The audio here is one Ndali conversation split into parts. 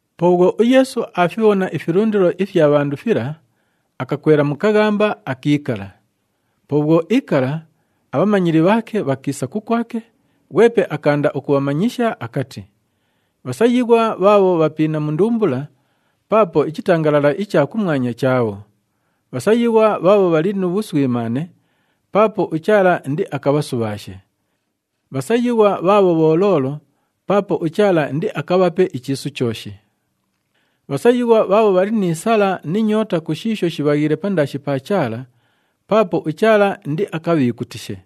Po bhwo uYeesu aafibhona ifilundilo ifya bhandu fila, akakwela mu kaghamba, akiikala. Po bhwo iikala, abhamanyili bhaake bhakiisa kukwake, ghwepe akaanda ukubhamanyisha akati, “Bhasayighwa bhaabho bhapiina mu ndumbula, paapo ichitangalala icha kumwanya chaabho. Bhasayighwa bhaabho bhali nu bhuswimaane, paapo uChaala indiakabhasubhaashe. Bhasayighwa bhaabho bholoolo, paapo uChaala indiakabhape ichiisu chooshi. Bhasayighwa bhaabho bhali ni sala ni nyoota ku shiisho shibhaghiile pandaashi pa Chaala, paapo uChaala indiakabhiikutishe.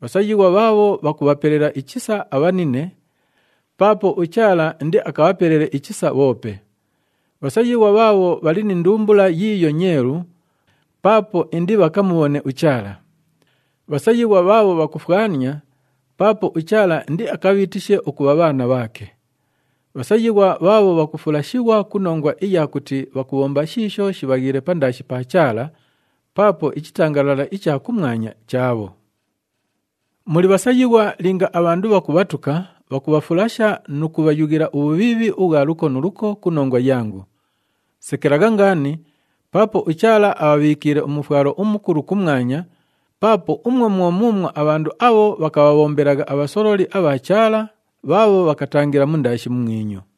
Bhasayighwa bhaabho bhakubhapelela ichisa abhanine, paapo uChaala indiakabhapelele ichisa bhoope. Bhasayighwa bhaabho bhali ni ndumbula yiiyo nyeelu, paapo indibhakamubhone uChaala. Bhasayighwa bhaabho bhakufwania, paapo uChaala indiakabhiitishe ukubha bhaana bhaake. Bhasayighwa bhaabho bhakufulashighwa ku nongwa iya kuti bhakubhomba shiisho shibhaghiile pandaashi pa Chaala, paapo ichitangalala icha kumwanya chaabho. “Muli bhasayighwa linga abhandu bhakubhatuka, bhakubhafulasha nu kubhayughila ubhubhiibhi ubhwa luko nu luko ku nongwa yangu. Sekelagha ngaani, paapo uChaala abhabhiikiile umufwalo umukulu kumwanya, paapo umwo mwo muumwo abhandu abho bhakabhabhombelagha abhasololi abha Chaala bhaabho bhakatangila mundaashi mumwinyu.”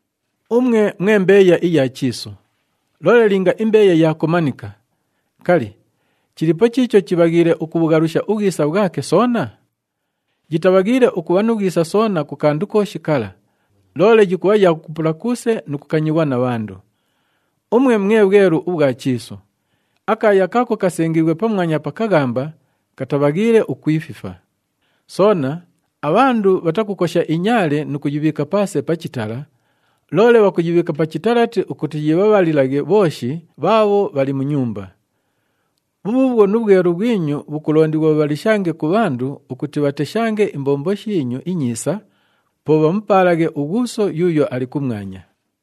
“Umwe mwe mbeeya iya chiisu. Loole linga imbeeya yaakomanika, kali, chiliipo chiicho chibhaghiile ukubhughalusha ubhwisa bhwake soona? Yitabhaghiile ukubha nu bhwisa soona ku kandu kooshi kala, loole yikubha ya kukupula kuuse nu kukanyighwa na bhandu. “Umwe mwe bhwelu ubhwa chiisu. Akaaya kaako kasengiighwe pamwanya pa kaghamba, katabhaghiile ukwififa. Soona, abhandu bhatakukosha inyaale nu kuyibhiika paase pa chitala, loole bhakuyibhiika pa chitalati ukuti yibhabhalilaghe bhooshi bhaabho bhali mu nyumba. Bhubhuubhwo nu bhwelu bhwinyu bhukulondighwa bhubhalishange ku bhandu ukuti bhateshange imbombo shiinyu inyiisa, po bhamupaalaghe uGhuuso yuuyo ali kumwanya.”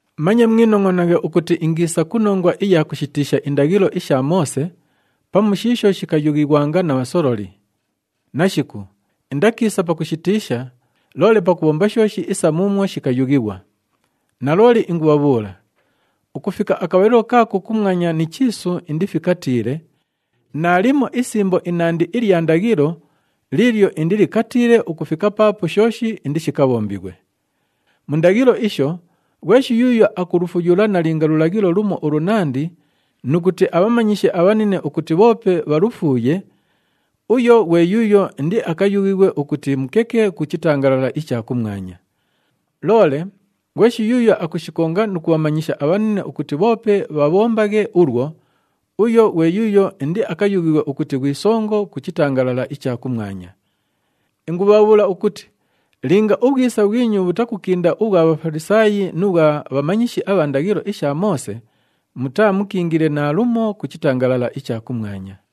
“Manye mwinongʼonaghe ukuti ingiisa ku nongwa iya kushitiisha indaghilo isha Moose, pamu shiisho shikayughighwanga na bhasololi. Nashiku! Indakiisa pakushitiisha, loole pakubhomba shooshi isa muumwo shikayughighwa. Nalooli ingubhabhuula, ukufika akabhalilo kaako kumwanya ni chiisu indifikatiile, naalimo isimbo inandi ilya ndaghilo liilyo indilikatiile ukufika paapo shooshi indishikabhombighwe. Mu ndaghilo isho, ghweshi yuuyo akulufuyula nalinga lulaghilo lumo ulunandi nu kuti abhamanyishe abhanine ukuti bhoope bhalufuuye, uyo ghwe yuuyo indiakayughighwe ukuti mukeke ku chitangalala icha kumwanya. Loole ghweshi yuuyo akushikonga nu kubhamanyisha abhanine ukuti bhoope bhabhombaghe ulwo, uyo, ghwe yuuyo indiakayughighwe ukuti ghwi songo ku chitangalala icha kumwanya. Ingubhabhuula ukuti linga ubhwisa bhwinyu bhutakukinda ubhwa Bhafalisaayi nu bhwa bhamanyishi abha ndaghilo isha Moose, mutaamukiingile naalumo ku chitangalala icha kumwanya.”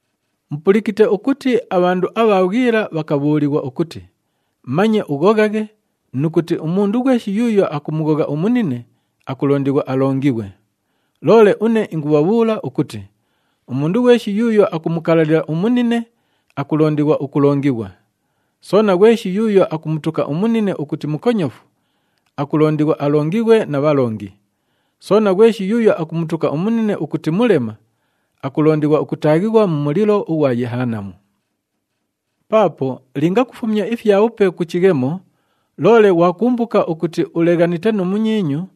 “Mupulikite ukuti abhandu abha bhwila bhakabhuulighwa ukuti, ‘Manye ughoghaghe nu kuti umundu ghweshi yuuyo akumughogha umunine, akulondighwa alongighwe.’ Loole une ingubhabhuula ukuti umundu ghweshi yuuyo akumukalalila umunine, akulondighwa ukulongighwa. Soona, ghweshi yuuyo akumutuka umunine ukuti mukonyofu, akulondighwa alongighwe na bhalongi. Soona, ghweshi yuuyo akumutuka umunine ukuti mulema, akulondighwa ukutaaghighwa mu mulilo ughwa Yehanamu! “Paapo linga kufumya ifyabhupe ku chighemo, loole ghwakumbuka ukuti uleghanite nu munyiinyu,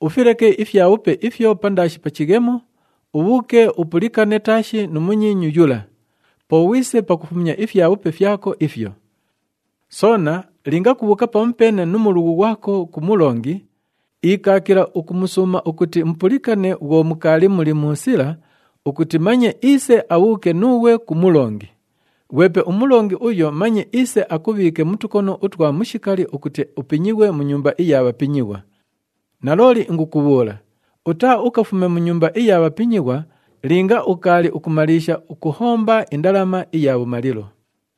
ufileke ifyabhupe ifyo pandaashi pa chighemo, ubhuuke upulikane taashi nu munyiinyu yula. Po ghwise pakufumya ifyabhupe fyako ifyo. “Soona linga kubhuuka pamupeene nu mulughu ghwako ku mulongi, ikaakila ukumusuuma ukuti mupulikane bhwo mukaali muli mu sila ukuti manye iise abhuuke nuughwe ku mulongi. Ghwepe umulongi uyo manye iise akubhiike mu tukono utwa mushikali ukuti upinyighwe mu nyumba iya bhapinyighwa. Nalooli ingukubhuula, utaaukafume mu nyumba iya bhapinyighwa linga ukaali ukumaliisha ukuhomba indalama iya bhumalilo.”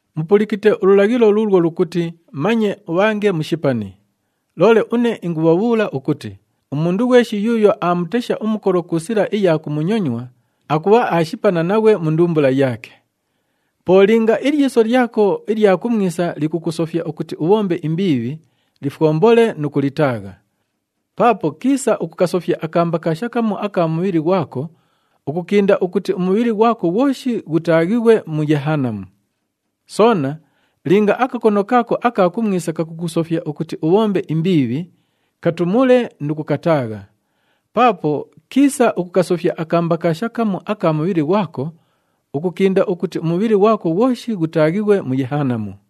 “Mupulikite ululaghilo luulwo lukuti, ‘Manye ubhange mushipani.’ Loole une ingubhabhuula ukuti umundu ghweshi yuuyo aamutesha umukolo ku sila iya kumunyonywa, akubha aashipana naghwe mu ndumbula yaake. Po linga ilyiso lyako ilya kumwisa likukusofya ukuti ubhombe imbiibhi, lifwombole nu kulitaagha. Paapo kiisa ukukasofya akambakaasha kamu aka mubhili ghwako, ukukinda ukuti umubhili ghwako ghwoshi ghutaaghighwe mu Yehanamu. Soona linga akakono kaako aka kumwisa kakukusofya ukuti ubhombe imbiibhi, katumule nu kukataagha. Paapo kiisa ukukasofya akambakaasha kamu aka mubhili ghwako, ukukinda ukuti umubhili ghwako ghwoshi ghutaaghighwe mu Yehanamu.”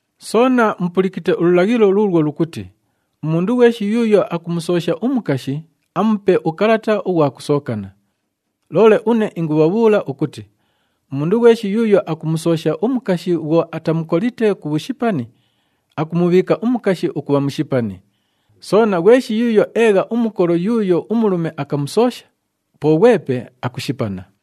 “Soona mupulikite ululaghilo luulwo lukuti, ‘Umundu ghweshi yuuyo akumusoosha umukashi, amupe ukalata ughwa kusookana.’ Loole une ingubhabhuula ukuti umundu ghweshi yuuyo akumusoosha umukashi bhwo atamukolite ku bhushipani, akumubhiika umukashi ukubha mushipani. Soona, ghweshi yuuyo eegha umukolo yuuyo umulume akamusoosha, po ghwepe akushipana.”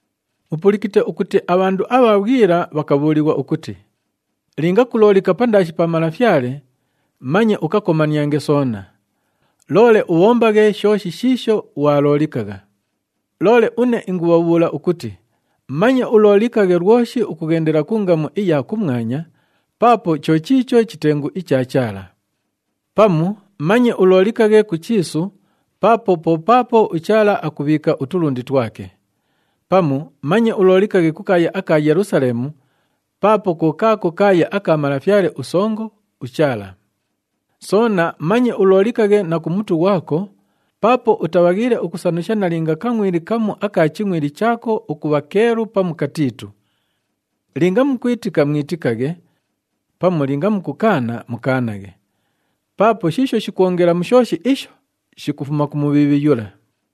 “Mupulikite ukuti abhandu abha bhwila bhakabhuulighwa ukuti, ‘Linga kuloolika pandaashi pa Malafyale, manye ukakomaniange soona. Loole ubhombaghe shooshi shiisho ghwaloolikagha.’ Loole une ingubhabhuula ukuti manye uloolikaghe lwoshi ukughendela ku ngamu iya kumwanya paapo cho chiicho chitengu icha Chaala. Pamu manye uloolikaghe ku chiisu paapo po paapo uChaala akubhiika utulundi twake. Pamu manye uloolikaghe ku kaaya aka Yelusaleemu paapo ko kaako kaaya aka Malafyale uSongo, uChaala. Soona manye uloolikaghe na ku mutu ghwako paapo utabhaghiile ukusanusha nalinga kangʼwili kamu aka chingʼwili chaako ukubha keelu pamu katiitu. Linga mukwitika, mwitikaghe. Pamu linga mukukaana, mukaanaghe. Paapo shiisho shikwongela mu shooshi isho, shikufuma ku Mubhiibhi yula.”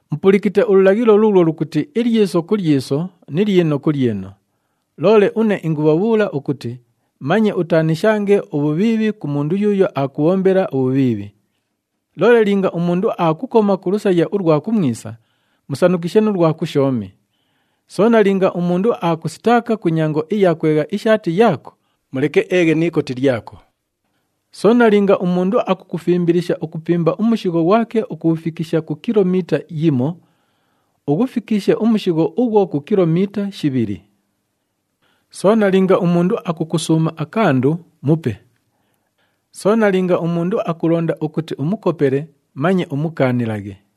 “Mupulikite ululaghilo luulwo lukuti, ‘Ilyiso ku lyiso ni lyino ku lyino.’ Loole une ingubhabhuula ukuti manye utaanishange ubhubhiibhi ku mundu yuuyo aakubhombela ubhubhiibhi. Loole linga umundu aakukoma ku lusaya ulwa kumwisa, musanushikishe nu lwa kushoomi. Soona linga umundu aakusitaaka ku nyango iya kwegha ishaati yaako, muleke eeghe ni ikoti lyako. Soona linga umundu akukufimbilisha ukupimba umushigho ghwake ukughufikisha ku kilomiita yimo, ughufikishe umushigho ughwo ku kilomiita shibhili. Soona linga umundu akukusuuma akandu, mupe. Soona linga umundu akulonda ukuti umukopele, manye umukaanilaghe.”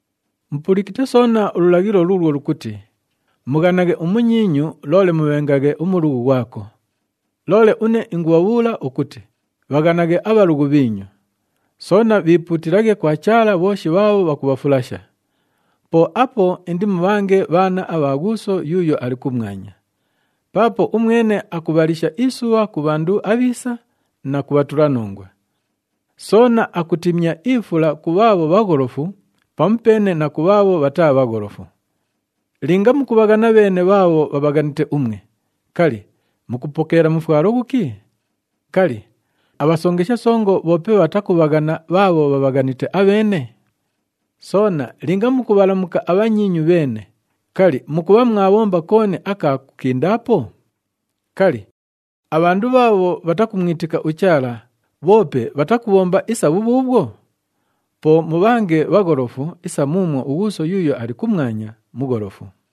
“Mupulikite soona ululaghilo luulwo lukuti, ‘Mughanaghe umunyiinyu,’ loole, ‘Mubhengaghe umulughu ghwako.’ Loole une ingubhabhuula ukuti bhaghanaghe abhalughu bhiinyu. Soona bhiipuutilaghe kwa Chaala bhooshi bhaabho bhakubhafulasha. Po apo indimubhange bhaana abha Ghuuso yuuyo ali kumwanya. Paapo umwene akubhalisha isubha ku bhandu abhiisa na ku bhatulanongwa. Soona akutimya ifula ku bhaabho bhagholofu pamupeene na ku bhaabho bhataa bhagholofu. Linga mukubhaghana bheene bhaabho bhabhaghanite umwe, kali, mukupokeela mufwalo ghuki? Kali, abhasongesha songo bhoope bhatakubhaghana bhaabho bhabhaghanite abheene? Soona linga mukubhalamuka abhanyiinyu bheene, kali, mukubha mwabhomba kooni aka kukindaapo? Kali, abhandu bhaabho bhatakumwitika uChaala bhoope bhatakubhomba isa bhubhuubhwo? Po mubhange bhagholofu isa muumwo uGhuuso yuuyo ali kumwanya mugholofu.”